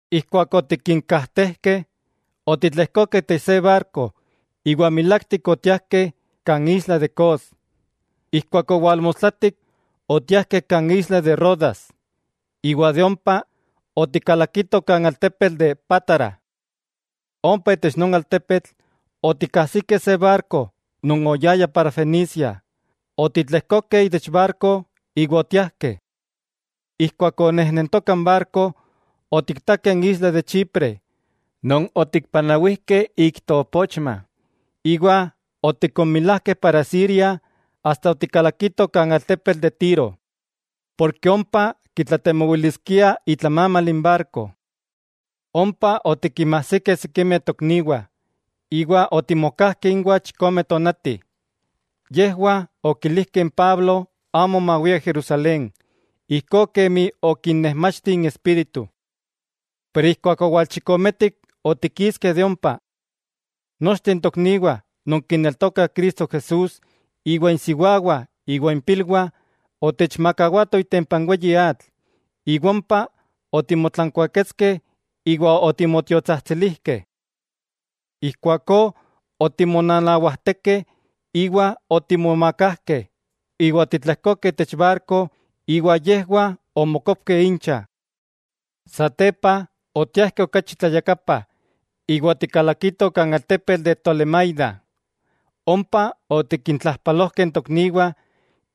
Ijkuak otikinkajtejkeh, otitlejkokeh itech se barko iwa milaktik otiajkeh kan isla de Cos. Ijkuak owalmostlatik otiajkeh kan isla de Rodas, iwa de ompa otikalakitoh kan altepetl de Pátara. Ompa itech non altepetl otikajsikeh se barko non oyaya para Fenicia, otitlejkokeh itech barko iwa otiajkeh. Ijkuak onejnentoka n barko, otiktakeh n isla de Chipre non otikpanawijkeh ik toopochma iwa otikonmilajkeh para Siria asta otikalakitoh kan altepetl de Tiro ken ompa kitlatemowiliskiah itlamamal n barko. Ompa otikinmajsikeh sikimeh tokniwah, iwa otimokajkeh inwah chikome tonati. Yejwah okilijkeh n Pablo amo mawia Jerusalén, ijkó kemi okinnejmachti n Espíritu. Pero ijkuak owalchikometik otikiskeh de ompa. Nochteh tokniwah non kineltokah Cristo Jesús iwa insiwawah iwa impilwah, otechmakawatoh itempa n weyi atl, iwa ompa otimotlankuaketskeh iwa otimotiotsajtsilijkeh. Ijkuakó otimonanawajtekeh, iwa otimomakajkeh iwa otitlejkokeh itech barko iwa yejwah omokopkeh incha. Satepa otiajkeh okachi tlayakapa iwa otikalakitoh kan altepetl de Tolemaida. Ompa otikintlajpalojkeh n tokniwah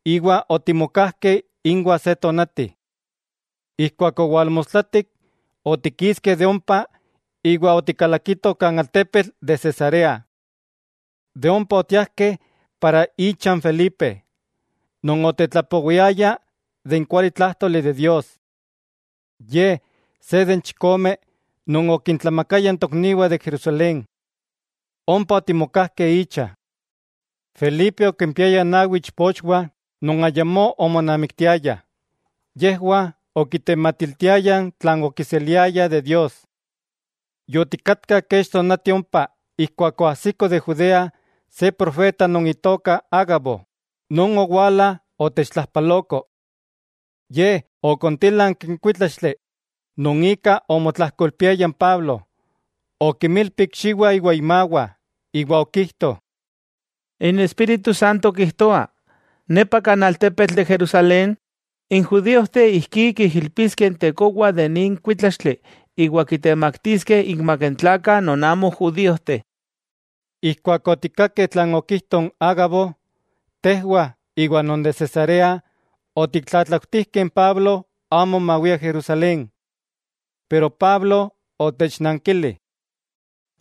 iwa otimokajkeh inwah se tonati. Ijkuak owalmostlatik, otikiskeh de ompa iwa otikalakitoh kan altepetl de Cesarea. De ompa otiajkeh icha n Felipe, non otetlapowiaya n kualitlájtoli de Dios. Ye se de n chikome non okintlamakayah n tokniwah de Jerusalén. Ompa otimokajkeh icha. Felipe okimpiaya nawi ichpochwah non ayamó omonamiktiayah. Yejwah okitematiltiayah tlan okiseliayah de Dios. Yotikatkah kech tonati ompa ijkuak oajsiko de Judea se profeta non itoka Ágabo, non owala otechtlajpaloko. Ye okontílanki n kuítlaxtli non ika omotlajkoilpiaya n Pablo, okimilpi ikxiwah iwa imawah iwa okijto: —N Espíritu Santo kijtoa, nepa kan altepetl de Jerusalén, n judíojteh ijkí kiijilpiskeh n tekowa de nin kuítlaxtli iwa kitemaktiskeh inmak n tlakah non amo judíojteh. Ijkuak otikkakeh tlan okijto n Ágabo, tejwah iwa non de Cesarea otiktlatlautijkeh n Pablo amo mawia Jerusalén. Pero Pablo otechnankili: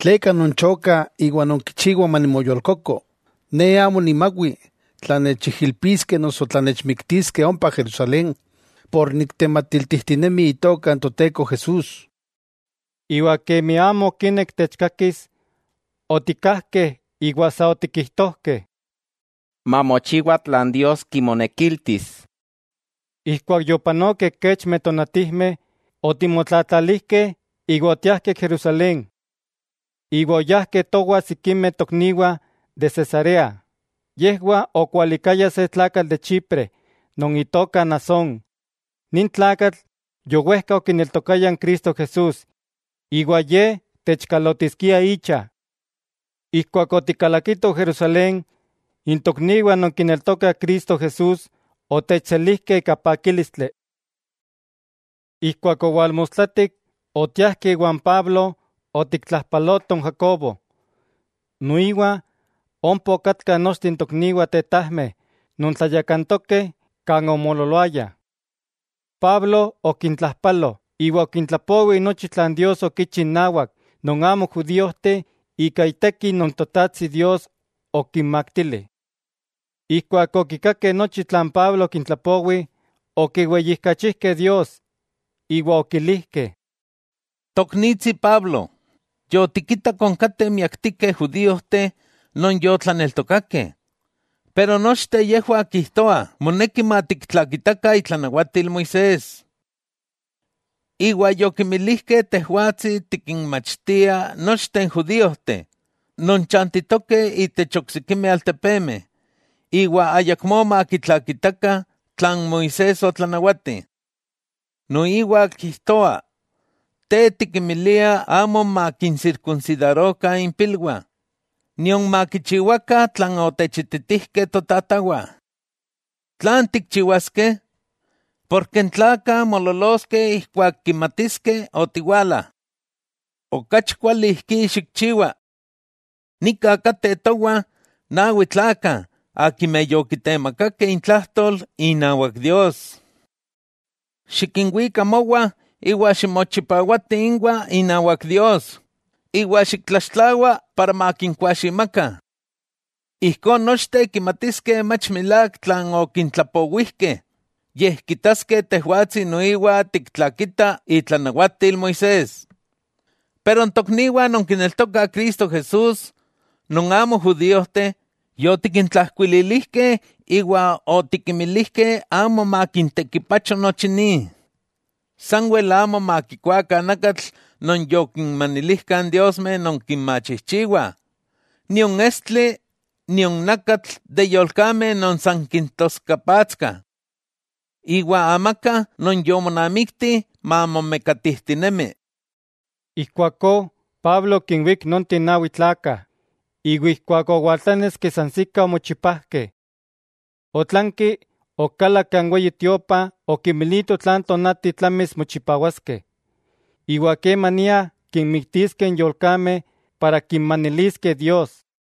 —¿Tleka nonchokah iwa nonkichiwah manimoyolkoko? Ne amo nimawi tla nechijilpiskeh noso tla nechmiktiskeh ompa Jerusalén por niktematiltijtinemi Itoka n Toteko Jesús. Iwa kemi amo okinek techkakis, otikkajkeh iwa sa otikijtojkeh: —Mamochiwa tlan Dios kimonekiltis. Ijkuak yopanokeh kechmeh tonatijmeh, otimotlatlalijkeh iwa otiajkeh Jerusalén. Iwa oyajkeh towah sikimeh tokniwah de Cesarea, yejwah okwalikayah se tlakatl de Chipre non itoka Nasón, nin tlakatl yowejka okineltokaya n Cristo Jesús iwa ye techkalotiskia icha. Ijkuak otikalakitoh Jerusalén, n tokniwah non kineltokah Cristo Jesús otechselijkeh ika pakílistli. Ijkuak owalmostlatik, otiajkeh iwan Pablo otiktlajpalotoh n Jacobo, noiwa ompa okatkah nochteh n tokniwah tetajmeh non tlayakantokeh kan omoololoayah. Pablo okintlajpalo iwa okintlapowi nochi tlan Dios okichi innawak non amo judíojteh ika iteki non Totajtsi Dios okimaktili. Ijkuak okikakeh nochi tlan Pablo okintlapowi, okiweyijkachijkeh Dios. Iwa okilijkeh: —Toknitsi Pablo, yotikitak onkateh miaktikeh judíojteh non yotlaneltokakeh, pero nochteh yejwah kijtoah moneki matiktlakitakah itlanawatil Moisés. Iwa yokimilijkeh tejwatsi tikinmachtia nochteh n judíojteh non chantitokeh itech oksikimeh altepemeh, iwa ayakmó makitlakitakah tlan Moisés otlanawati. Noiwa kijtoah te tikinmilia amo makinsirkunsidarokah impilwah nion makichiwakah tlan otechititijkeh totatawah. ¿Tlan tikchiwaskeh? Porke n tlakah moololoskeh ijkuak kimatiskeh otiwala. Okachi kuali ijkí xikchiwa: Nika kateh towah nawi tlakah akimeh yokitemakakeh intlajtol inawak Dios. Xikinwika mowah iwa ximochipawati inwah inawak Dios iwa xiktlaxtlawa para makinkuaximakah. Ijkó nochteh kimatiskeh mach milák tlan okintlatlapowijkeh, yej kitaskeh tejwatsi noiwa tiktlakita itlanawatil Moisés. Pero n tokniwah non kineltokah Cristo Jesús non amo judíojteh, yotikintlajkuililijkeh iwa otikinmilijkeh amo makintekipacho nochi ni, sanwel amo makikuakah nakatl non yokinmanilijkah n diosmeh non kinmachijchiwah, nion estli, nion nakatl de yolkameh non san kintoskapatskah. Iwa amaka non yomonamikti mamomekatijtinemi. Ijkuakó Pablo okinwík nonteh nawi tlakah, iwa ijkuak owaltláneski sansikah omochipajkeh. Otlanki okalak kan Weyi Tiopa okimilito tlan tonati tlamis mochipawaskeh, iwa kemania kinmiktiskeh n yolkameh para kinmaniliskeh Dios.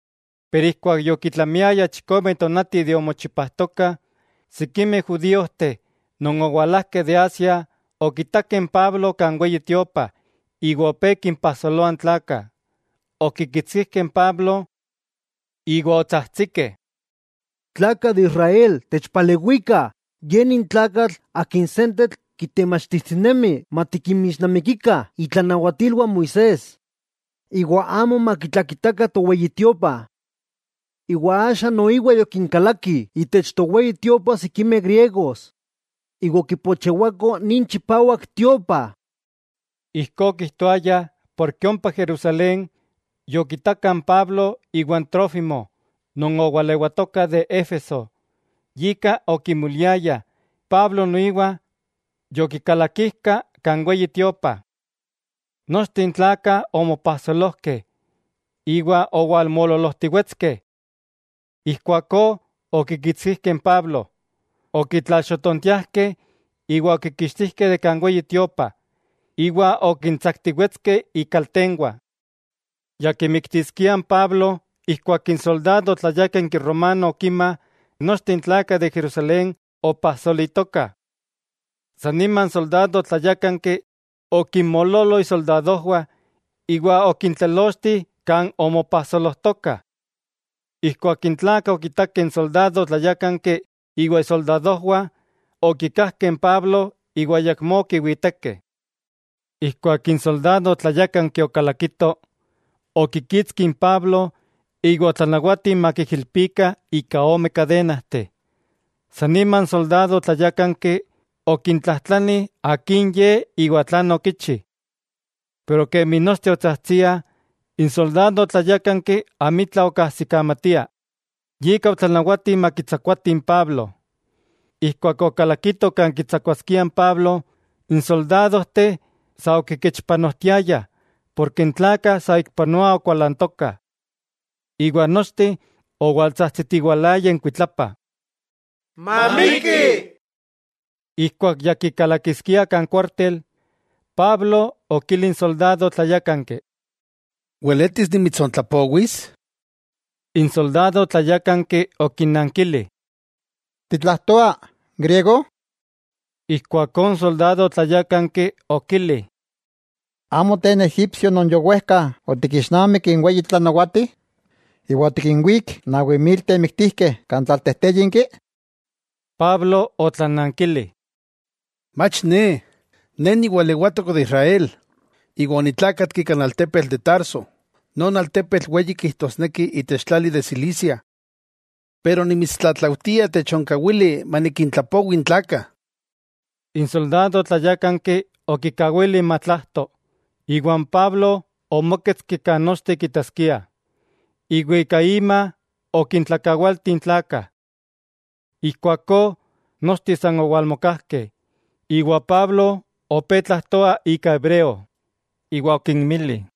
Pero ijkuak yokitlamiayah chikome tonati de omochipajtokah, sikimeh judíojteh non owalajkeh de Asia okitakeh n Pablo kan Weyi Tiopa iwa opé kimpajsoloah n tlakah. Okikitskijkeh n Pablo iwa otsajtsikeh: —¡Tlakah de Israel, techpalewikah! Ye nin tlakatl akin sentetl kitemachtijtinemi matikinmixnamikikah itlanawatilwah Moisés, iwa amo matiktlakitakah toweyi Tiopa. Iwa axa noiwa yokinkalakih itech toweyi Tiopa sikimeh griegos, iwa okipochewakoh nin chipawak Tiopa. Ijkó okijtoayah porke ompa Jerusalén, yokitakah n Pablo iwa Trófimo non owalewatoka de Éfeso; yika okimoliayah Pablo noiwa yokikalakijka kan Weyi Tiopa. Nochteh n tlakah omopajsolojkeh, iwa owalmoololojtiwetskeh. Ijkuakó okikitskijkeh n Pablo, okitlalxotontiajkeh iwa okikixtijkeh de kan Weyi Tiopa, iwa okintsaktiwetskeh ikaltenwah. Ya kimiktiskiah n Pablo ijkuak n soldado tlayákanki romano okima nochteh n tlakah de Jerusalén opajsolitokah. San nima n soldado tlayákanki okinmoololo isoldadojwah iwa okintlelochti kan omopajsolojtokah. Ijkuak n tlakah okitakeh n soldado tlayákanki iwa isoldadojwah, okikajkeh n Pablo iwa ayakmó okiwitekeh. Ijkuak n soldado tlayákanki okalakito, okikitski n Pablo iwa otlanawati makiijilpikah ika ome kadenajteh. San nima n soldado tlayákanki okintlajtlani akin ye iwa tlan okichi. Kemi nochteh otsajtsiah, n soldado tlayákanki amitla okajsikamatia, yika otlanawati makitsakuatih n Pablo. Ijkuak okalakitoh kan kitsakuaskiah n Pablo, n soldadojteh sa okikechpanojtiayah porke n tlakah saikpanoa okualantokah. Iwa nochteh owaltsajtsitiwalayah inkuitlapa: —¡Mamikki! Ijkuak ya kikalakiskiah kan kuártel, Pablo okili n soldado tláyakanki: —¿Weletis nimitsontlapowis? N soldado tlayákanki okinankili: —¿Titlajtoa griego? Ijkuakó n soldado tlayákanki okili: —¿Amo te n egipsio non yowejka otikixnamik n weyi tlanawati, iwa otikinwík nawi mil temiktijkeh kan tlaltejtéyinki? Pablo otlanankili: —¡Mach ne! Ne niwalewatok de Israel, iwa onitlákatki kan altepetl de Tarso, non altepetl weyi kijtosneki itech tlali de Cilicia. Pero nimitstlatlaujtia techonkawili manikintlapowi n tlakah. N soldado tlayákanki okikawili matlajto, iwa n Pablo omóketski kan nochteh kitaskiah, iwa ika ima okintlakawaltih n tlakah. Ijkuakó nochteh san owalmokajkeh iwa Pablo opé tlajtoa ika hebreo, iwa okinmili: